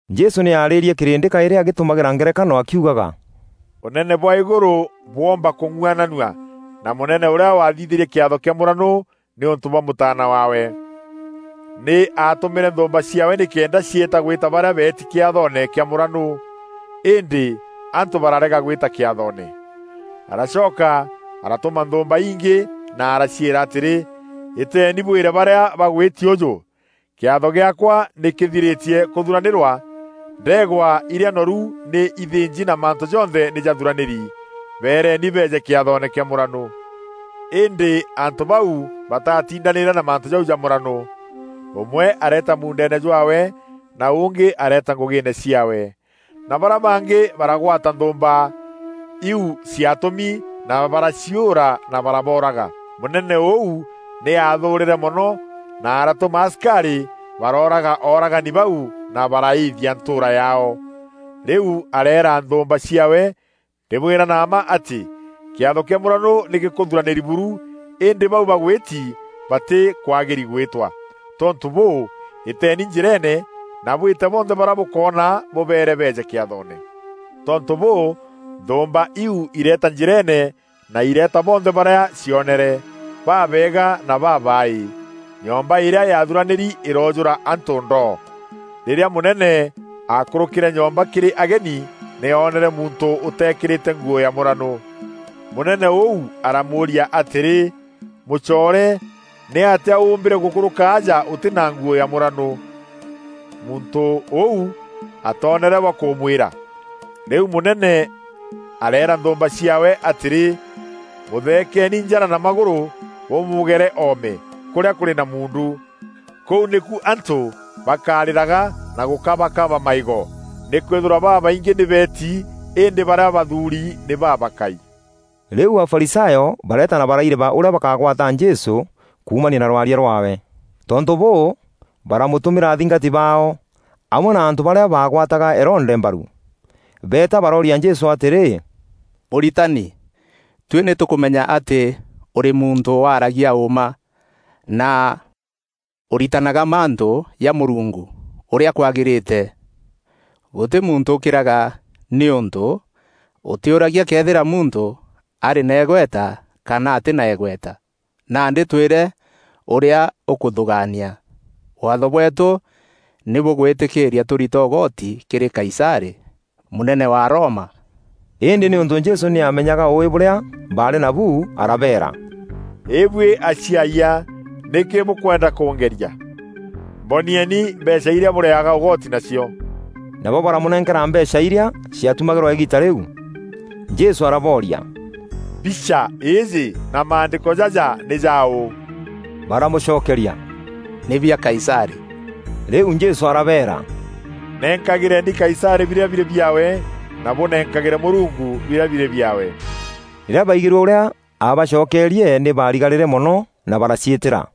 Jesû nî aarîrie kîrîndî kaîrî agîtumagîra ngerekano akiugaga: “Ûneene bwa îgûrû bwoomba kûng'uananua na mûnene ûrîa wathithîrie kîatho kîa mûranû nîûntû bwa mûtaana waawe. Nî aatûmîre nthûûmba ciaawe nîkenda ciîta gwîta barîa beeti kîathoone kîa mûranû, îndî antû barareega gwîta kîathoone. Aracoka aratûma nthûûmba ingî na araciîra atîrî, ‘Îteeni bwîre barîa bagwîti ûjû: kîatho gîaakwa nî kîthirîtie kûthuranîrwa; ndeegwa irîa noru nî ithînji na mantû jonthe nî jathuranîri. Bereeni beeje kîathoone kîa mûranû.’ Îndî antû bau batatindanîre na mantû jau ja mûranû. Ûmwe areeta muundeene jwaawe, na ûngî areeta ngûgîîne ciaawe, na barîa bangî baragwata nthûûmba iu ciatûmi na baraciûûra na barabooraga. Mûnene ûu nî aathûûrîre mono, na aratûma asikarî barooraga ooragani bau na baraîîthia ntûûra yaao. Rîu areera nthûûmba ciaawe, ‘Ndîbwîra na mma atî kîatho kîa mûranû nî gîkûthuranîri buru, îndî bau bagwîti batîkwagîri gwîtwa. Tontû bûû, îteeni njîreene na bwîte bonthe barîa bûkoona bûbeere beeje kîathoone.’ Tontû bûû, nthûûmba iu ireeta njîreene na ireeta bonthe barîa cionere: babeega na babaaî. Nyomba îrîa yaathuranîri îroojûra antû ndoo. “Rîrîa mûnene aakûrûkîre nyomba kîrî ageni, nî oonere muntû ûteekîrîte nguû ya mûranû. Mûnene ûu aramûûria atîrî, ‘Mûcoore, nîatîa ûûmbîre gûkûrûka aja ûtî na nguû ya mûranû?’ Muntû ûu atoonere bwa kûmwîra. Rîu mûnene areera nthûûmba ciaawe atîrî, ‘Mûtheekeni njara na magûrû, bûmûgere oome kûrîa kûrî na muundu. Kûu nîku antû bakarîraga na gûkabakabaga maîgo.’ Nîkwîthîrwa babaingî nî beeti îndî barîa bathuuri nî babakai.” Rîu Afarisayo bareeta na baraireba ûrîa bakagwata Jesû kuumania na rwaria rwaawe. Tontû bûû, baramûtûmîra athingati baao, amwe na antû barîa baagwataga Herode mbaru. Beeta barooria Jesû atîrî, “Mûritani, tuî nî tûkûmenya atî ûrî muntû waragia ûûma, na ûritanaga mantû ja Mûrungu ûrîa kwagîrîte. Gûtî muntû ûkîraga nîûntû ûtîûragia këethîra muntû arî na îgweta kana atî na îgweta. Nandî twîre ûrîa ûkûthûgaania. Waatho bweetû nî bûgwîtîkîîria tûrita ûgoti kîrî Kaisarî, mûnene wa Roma?” Îndî nîûntû Jesû nî aamenyaga ûûî bûrîa baarî nabu, arabeera, “Îbuî aciayia, nîkî bûkwenda kûngeria? Mbonieni mbeecha irîa bûrîaga ûgoti nacio.” Nabo baramûnenkera mbeecha irîa ciatumagîrwa îgiita rîu. Jesû arabooria, “Mbicha îîjî na maandîko jaja nî jaû?” Baramûcokeria, “Nî bia Kaisarî.” Rîu Jesû arabeera, “Nenkagîreeni Kaisarî birîa birî biaawe, na bûnenkagîre Mûrungu birîa birî biaawe.” Rîrîa baigîrue ûrîa aabacokerie nî baarigarîre mono na baraciîtîra.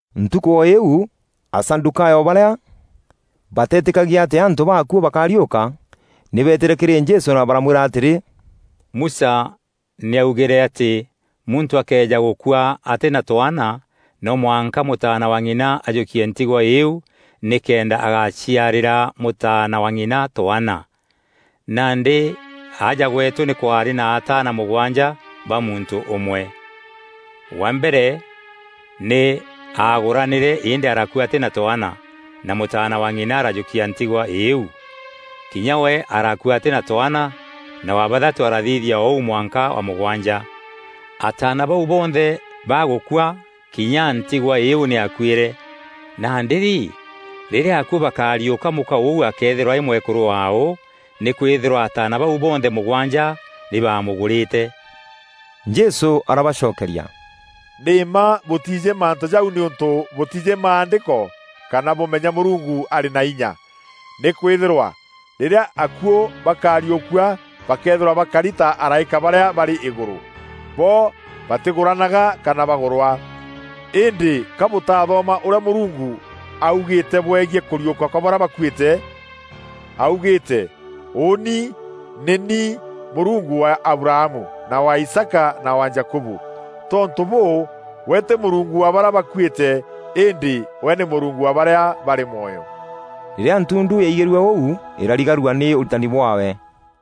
Ntukû o îîu Asadûkayo barîa batetîkagia atî antû baakuû bakariûka, nî beetîre kîrî Jesû na baramwîra atîrî, “Musa nî augîre atî muntû akëeja gûkua atî na twaana, no mwanka mûtaana wa ng'ina ajûkie ntigwa îîu nîkenda agaciarîra mûtaana wa ng'ina twaana. Nandî aja gweetû nî kwaarî na ataana mûgwanja ba muntû ûmwe. Wa mbere nî aagûranîre îndî arakua atî na twaana, na mûtaana wa ng'ina arajûkia ntigwa îîu. Kinya we arakua atî na twaana, na wa bathatû arathithia o ûu mwanka wa mûgwanja. Ataana bau bonthe bagûkua kinya ntigwa îîu nî yakuîre. Nandî rî, rîrîa akuû bakariûka mûka ûu akeethîrwa arî mwekûrû waaû, nîkwîthîrwa ataana bau bonthe mûgwanja nî baamûgûrîte?” Jesû arabacokeria, “Nî mma bûtiijî mantû jau nîûntû bûtiijî Maandîko kana bûmenya Mûrungu arî na inya. Nîkwîthîrwa rîrîa akuû bakariûkua bakeethîrwa bakari ta araîka barîa barî îgûrû, bo batîgûranaga kana bagûrwa. Îndî ka bûtathoma ûrîa Mûrungu augîîte bwegiî kûriûka kwa barîa bakuîte? Augîîte, ‘Ûûni nî ni Mûrungu wa Abrahamu, na wa Isaaka na wa Jakubu.’ Tontû bûû, we tî Mûrungu wa barîa bakuîte, îndî we nî Mûrungu wa barîa barî mwoyo.” Rîrîa ntundu yaigîrue ûu îrarigarua nî ûritani bwaawe.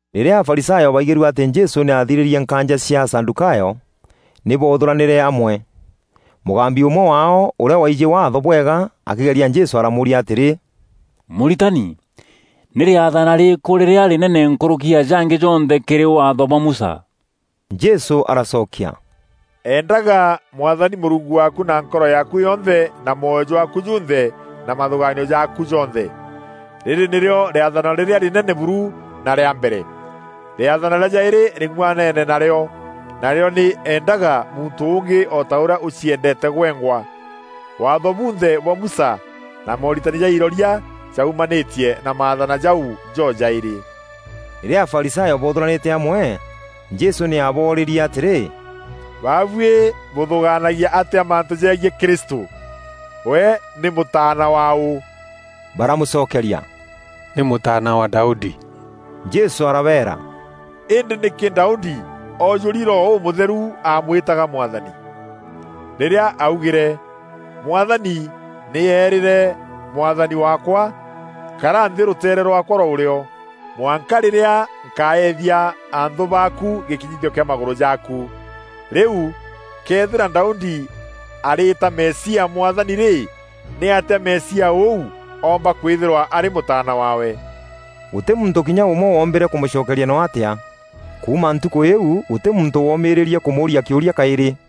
Rîrîa Afarisayo baigîrue atî Jesû nî aathirîrie nkaanja cia Asadûkayo, nî boothûranîre amwe. Mûgambi ûmwe waao, ûrîa waijî Waatho bwega akîgeria Jesû aramûûria atîrî, “Mûritani, nî rîathana rîrîkû rîrîa rînene nkûrûki ya jangî jonthe kîrî Waatho bwa Musa?” Jesû aracokia, “Endaga Mwathani Mûrungu waaku na nkoro yaaku yonthe, na mwoyo jwaaku junthe, na mathûgaanio jaaku jonthe. Rîrî nîrîo rîathana rîrîa rînene buru na rîa mbere. Rîathana rîa jaîrî rîng'uanene na rîo. Narîo nî: ‘Endaga muntû ûngî o ta ûrîa ûciendeete gwengwa!’ Waatho bunthe bwa Musa na mooritani ja iroria jaumanîtie na maathana jau jo jaîrî.” Rîrîa Afarisayo boothûranîte amwe, Jesû nî aaboorîrie atîrî, “Babuî bûthûgaanagia atîa mantû jegiî Kristû? We nî mûtaana waû?” Baramûcokeria, “Nî mûtaana wa Daudi.” Jesû arabeera, “Îndî nîkî Daudi oojûri Roho Ûmûtheru aamwîtaga ‘Mwathani?’ rîrîa augîre: ‘Mwathani nî eerîre Mwathani waakwa: Kara nthî rûteere rwaakwa rwa ûrîo, mwanka rîrîa nkaethia anthû baaku gîkinyithio kîa magûrû jaaku.’ “Rîu këethîra Daudi arîîta Mesia ‘Mwathani’ rî, nîatîa Mesia ûu oomba kwîthîrwa arî mûtaana waawe?” Gûtî muntû kinya ûmwe woombîre kûmûcokeria noo atîa. Kuuma ntukû îîu gûtî muntû woomîîrîrie kûmûûria kîûria kaîrî.